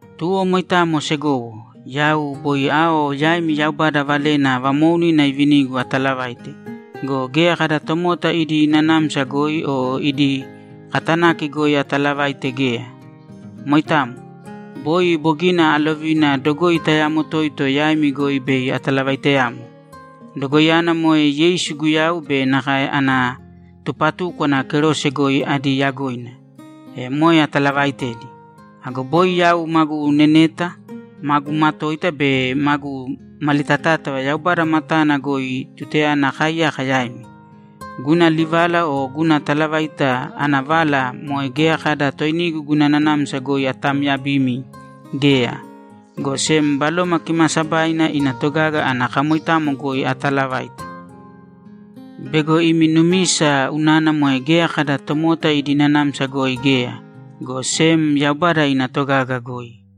Tuwo moitamo, segowo, yau boi ao yaimi Yaubada valena vamoounina ivinigu ataalavaite go, geya kada tomota idi nanamsa goi o idi katanaki goi atalavaite geya. Moitamo. Boi bogina alovina dogoi tayamo toito yaimi goi bei atalavaiteyamo. Dogoiyana moe Yeisu Guyau be nakae ana tupatúkwana kerose goi adi yagoina. E moe atalavaitedi. Ago boi yau magu neneta, magu matoita be magu malitatátava Yaubada matana goi tutayana akaaiyaka yaimi. Guna livala o guna talavaita ana vala moe geya kada toinigu guna nanamsa goi atamyabimi geya, go sem Baloma Kimaasabaina ina togaga ana kamoitamo goi ataalavaita bego imi numisa unana moe geya kada tomota idi nanamsa goi geya, go sem Yaubada ina togaga goi.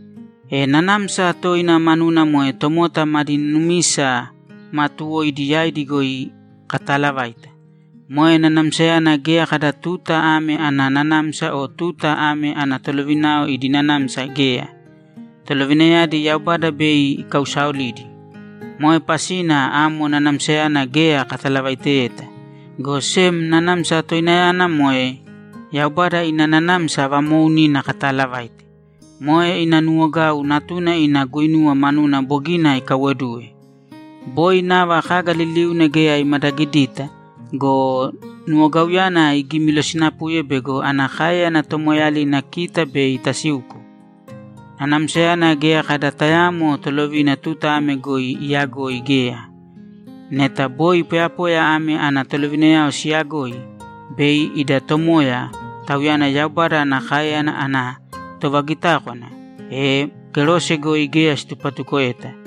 E nanamsa toina manuna moe tomota madi numisa maatuwoidi yaidi goi kataalavaita. Moe nanamsayana geya kada tuta ame ana nanamsa o tuta ame ana tolovinao idi nanamsa geya; tolovinayadi Yaubada bei ikausaolidi. Moe pasina amo nanamsayana geya katalavaiteyeta, go sem nanamsa toinayana moe Yaubada ina nanamsa vamoounina kataalavaite. Moe ina nuwogau Natuna ina guinuwa manuna bogina ikaiwoduwe. Boi nava kaga liliuna geya imadagidita go, nuwogauyana igimilosinapuye bego ana káeyana tomoeeyalina kita bei tasiuko. Nanamsayana geya kada tayaamo tolovina tuta ame goi iyagoi geya. Neta boi poyapoya ame ana tolovinayao siyagoi, bei ida Tomoya, Tauyana Yaubada ana káeyana ana tovagitákwana, e kerose goi geya situpatukoeta,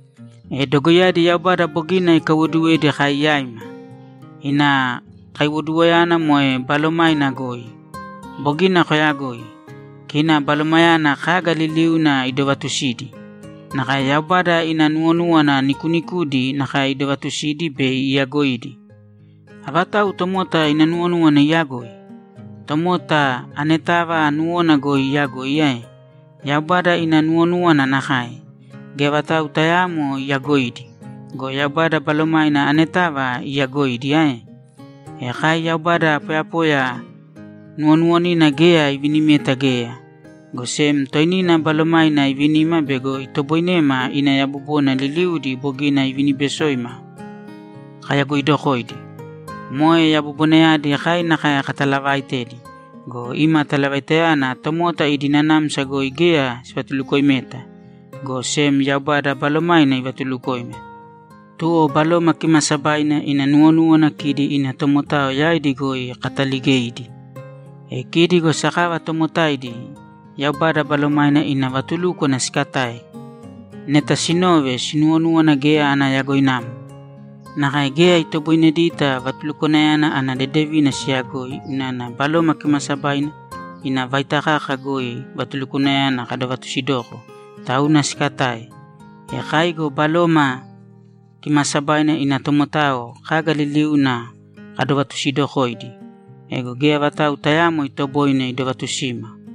E dogoiyadi Yaubada bogina ikaiwoduwedi kai yaima. Ina kaiwoduwoyana moe Balomaina goi. Bogina koyagoi. Kina Balomainayana kaga liliuna idovaatusidi. Nakae Yaubada ina nuwonúwana nikuunikudi nakae idovatusidi be iyagoidi. Avatau tomota ina nuwonúwana iyagoi? Tomota anetava nuwona goi iyagoi ae? Yaubada ina nuwonúwana nakae; geya vatau tayaamo iyagoidi go, Yaubada Balomaina anetava iyaagoidi ae? E kai Yaubada poyapoya nuwonuwonina geya ivinimeta geya, go sem toinina Balomaina ivinima bego itoboinema ina yabobona liliudi bogina iviniibesoima kayagoidokoidi. Moe yabobonayadi kai nakae katalavaaitedi go, ima talavaitayana tomota idi nanamsa goi geya sivatulukoimeta, go sem Yaubada Balomaina ivatulukoima. Tuwo Baloma Kimaasabaina ina nuwonúwana kidi ina tomotao yaidi goi kataligeidi. E kidi go sakava tomotaidi Yaubada Balomaina ina vatulúkwana sikatae. Neta sinove, sinuwonúwana geya ana yagoinamo. Nakae geya itoboinedita vatulukwanayana ana dedevina siyagoi unana Baloma Kimaasabaina ina vaita kaka goi vatulukwanayana kadovatusidoko, tauna sikatae. E kai go Baloma Kimaasabaina ina tomotao kaga liliuna kadovatusidokoidi. Ego geya vatau tayaamo itoboine idovatusima.